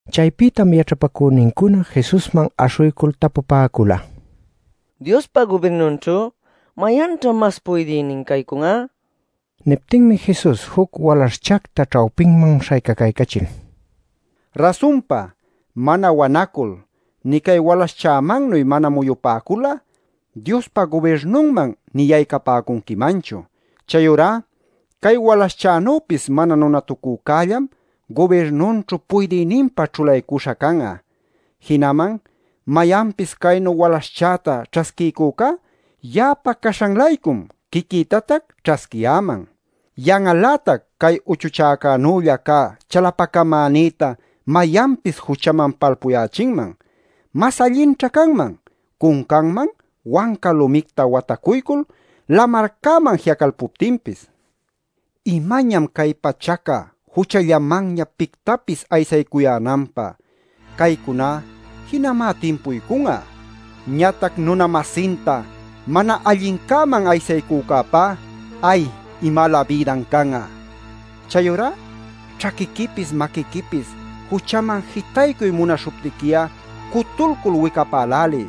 Chaypïtam yaćhapacünincuna Jesusman aśhuycul tapupäcula: “Diospa gubirnunćhu ¿mayanćha mas puydïnin caycun'a?” nil. Niptinmi Jesus juc walaśhchacta ćhawpinman śhaycacaycachil: “Rasunpa, mana wanacul nï cay walaśhchämannuy mana muyupäcul'a, Diospa gubirnunman nï yaycapäcunquimanchu. Chayurá cay walaśhchänüpis mana nunatucücällam gubirnunćhu puydïninpa ćhulaycuśha can'a. Jinaman mayanpis caynu walaśhchäta ćhasquiycücá, ya'apa caśhan-laycum quiquïtatac ćhasquiyäman. “Yan'al-lätac cay uchuchäcunanülla cä chalapacamänïta mayanpis juchaman palpuyächinman. Mas allinćha canman cuncanman wanca lumicta watacuycul lamarcäman ji'acalpuptinpis. ¡Imañam cay pachaca juchallamanña pictapis aysaycuyänanpä! Caycuná jinamá timpuycun'a. Ñatac nuna-masinta mana allincäman aysaycücäpá ¡ay imalä bïdan can'a! “Chayurá ćhaquiquipis maquiquipis juchaman jitaycuy munaśhuptiqui'a, cutulcul wicapäläliy.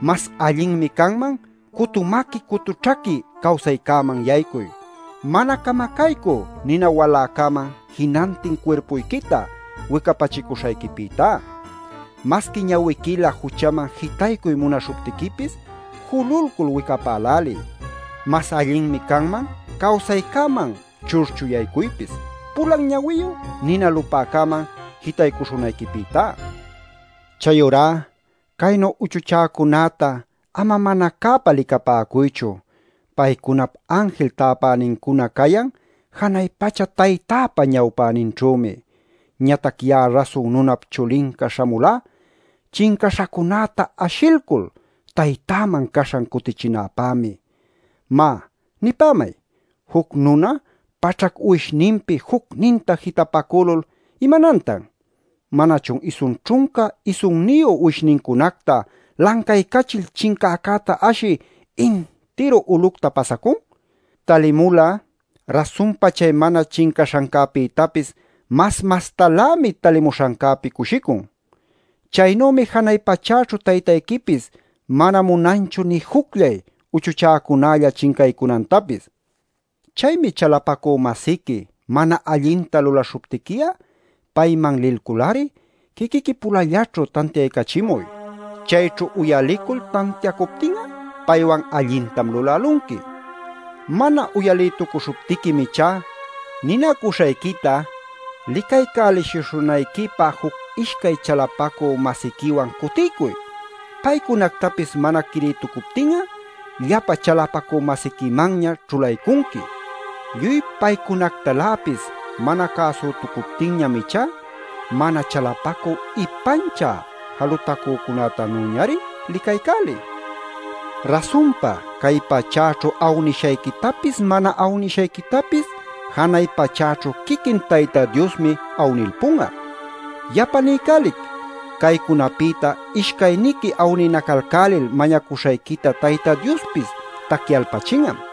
Mas allinmi canman cutu maqui cutu ćhaqui cawsaycäman yaycuy, mana camacaycü nina waläcäman jinantin cuirpuyquita wicapachicuśhayquipïtá. Masqui ñawiquilä juchaman jitaycuy munaśhuptiquipis, jululcul wicapäläliy. Mas allinmi canman cawsaycäman churchu yaycuypis, pulan ñawiyu nina lupäcäman jitaycuśhunayquipïtá. “Chayurá caynu uchuchäcunäta ama mana cäpa licapäcuychu. Paycunap anjil täpänincuna cayan janay pacha Taytäpa ñawpäninćhümi. ˻ Ñatac ya'a Rasun Nunap Chulinca śhamulá, chincaśhacunäta ashilcul Taytäman caśhan cutichinäpämi.˼ “Má, nipämay: Juc nuna paćhac uwishninpi jucninta jitapacülul ¿imanantan? ¿Manachun isun ćhunca isunniyu uwishnincunacta lancaycachil chincäcäta ashï intiru ulucta pasacun? Talimul'a rasunpa chay mana chincaśhancäpïtapis mas mastalämi talimuśhancäpi cushicun. Chaynümi janay pachäćhu Taytayquipis mana munanchu nï jucllay uchuchäcunalla chincaycunantapis. “Chaymi chalapacü-masiqui mana allinta lulaśhuptiqui'a, payman lilcul-ari quiquiqui-pulallaćhu tantiaycachimuy. Chayćhu uyalicul tantiacuptin'a, paywan allintam lulälunqui. Mana uyalïtucuśhuptiquim ichá, ninacuśhayquita licaycäliwshishunayquipä juc-ishcay chalapacü-masiquiwan cutiycuy. Paycunactapis mana quirïtucuptin'a llapa chalapacü-masiquimanña ćhulaycunqui. Lluy paycunactaläpis mana cäsütucuptinñam ichá mana chalapacü ipanchä jalutacücätanüñari licaycäliy. Rasunpa cay pachäćhu awnishayquitapis mana awnishayquitapis janay pachäćhu quiquin Tayta Diosmi awnilpun'a. Yapa niycälic: caycunapïta ishcayniqui awninacalcälil mañacuśhayquita Tayta Diospis tacyalpachin'am.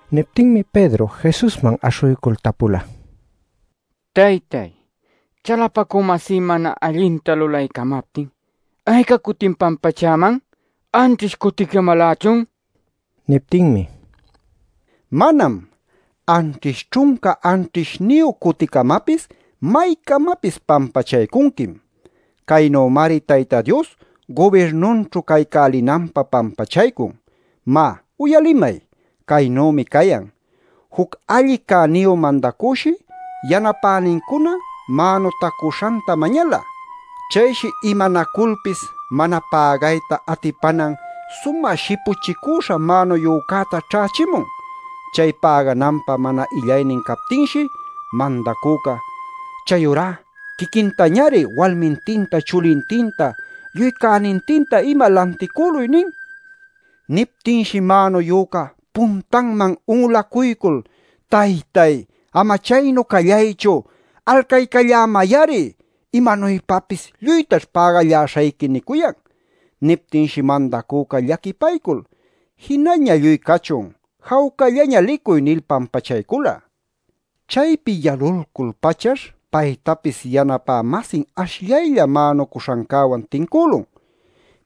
Niptinmi Pedro Jesusman aśhuycul tapula: “Taytay, chalapacü-masí mana allinta lulaycamaptin, ¿ayca cutim pampachäman? ¿Anćhish cuticamalächun?” nil. Niptinmi: “Manam. Anćhish ćhunca anćhishniyu cuticamapis maycamapis pampachaycunquim. “Caynümari Tayta Dios gubirnunćhu caycälinanpä pampachaycun. Má, uyalimay. Caynümi cayan: Juc alli cäniyu mandacüshi yanapänincuna mänutacuśhanta mañala. Chayshi imanaculpis mana pägayta atipanan sumä shipuchicüśha mänuyücäta ćhächimun. Chay pägananpä mana illaynin captinshi, mandacüca: ‘Chayurá quiquintañari, walmintinta, chulintinta, lluy cänintinta ima lanticüluy’ nin. Niptinshi mänuyüca puntanman un'ulacuycul: ‘¡Taytay, ama chaynu callaychu! ¡Alcaycallämay-ari! ¡Imanuypapis lluytaćh pägalläśhayqui!’ nicuyan. Niptinshi mandacüca llaquipaycul: ‘Jinaña lluy cachun. Jawcallaña licuy’ nil pampachaycula. Chaypi yalulcul-pachash paytapis yanapä-masin ashllaylla mänucuśhancäwan tincülun.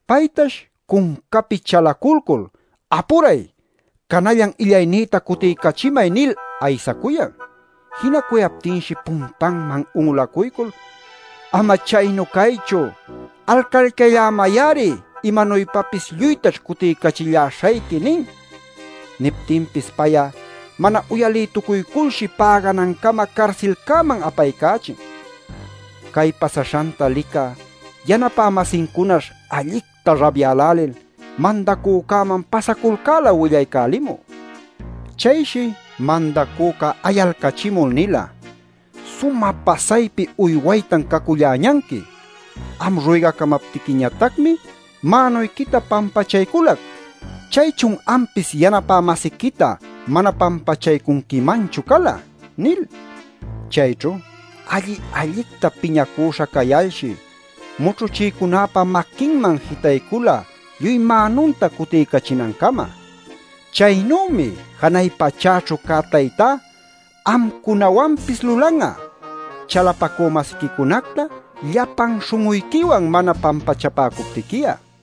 Paytash cuncapi chalaculcul: ‘¡Apuray, canallan illaynïta cutiycachimay!’ nil aysacuyan. Jinacuyaptinshi puntanman un'ulacuycul: ‘¡Ama chaynu caychu! ¡Alcaycallämay-ari! ¡Imanuypapis lluytaćh cutiycachilläśhayqui!’ nin. Niptinpis pay'a mana uyalïtucuyculshi päganancama carsilcäman apaycächin. Cay pasaśhanta licä yanapä-masincunash allicta rabyälälil mandacücäman pasaculcäla willaycälimü. Chayshi mandacüca ayalcachimul nila: ‘¡Sumä pasaypi uywaytan caculläñanqui! Am ruygacamaptiquiñatacmi mänuyquita pampachayculac. Chaychun ampis yanapä-masiquita mana pampachaycunquimanchu cala’ nil. Chayćhu alli-allicta piñacüśha cayalshi mućhuchïcunäpa maquinman jitaycula lluy mänunta cutiycachinancama. Chaynümi janay pachäćhu cä Taytá amcunawanpis lulan'a chalapacü-masiquicunacta llapan śhun'uyquiwan mana pampachapäcuptiqui'a” nila.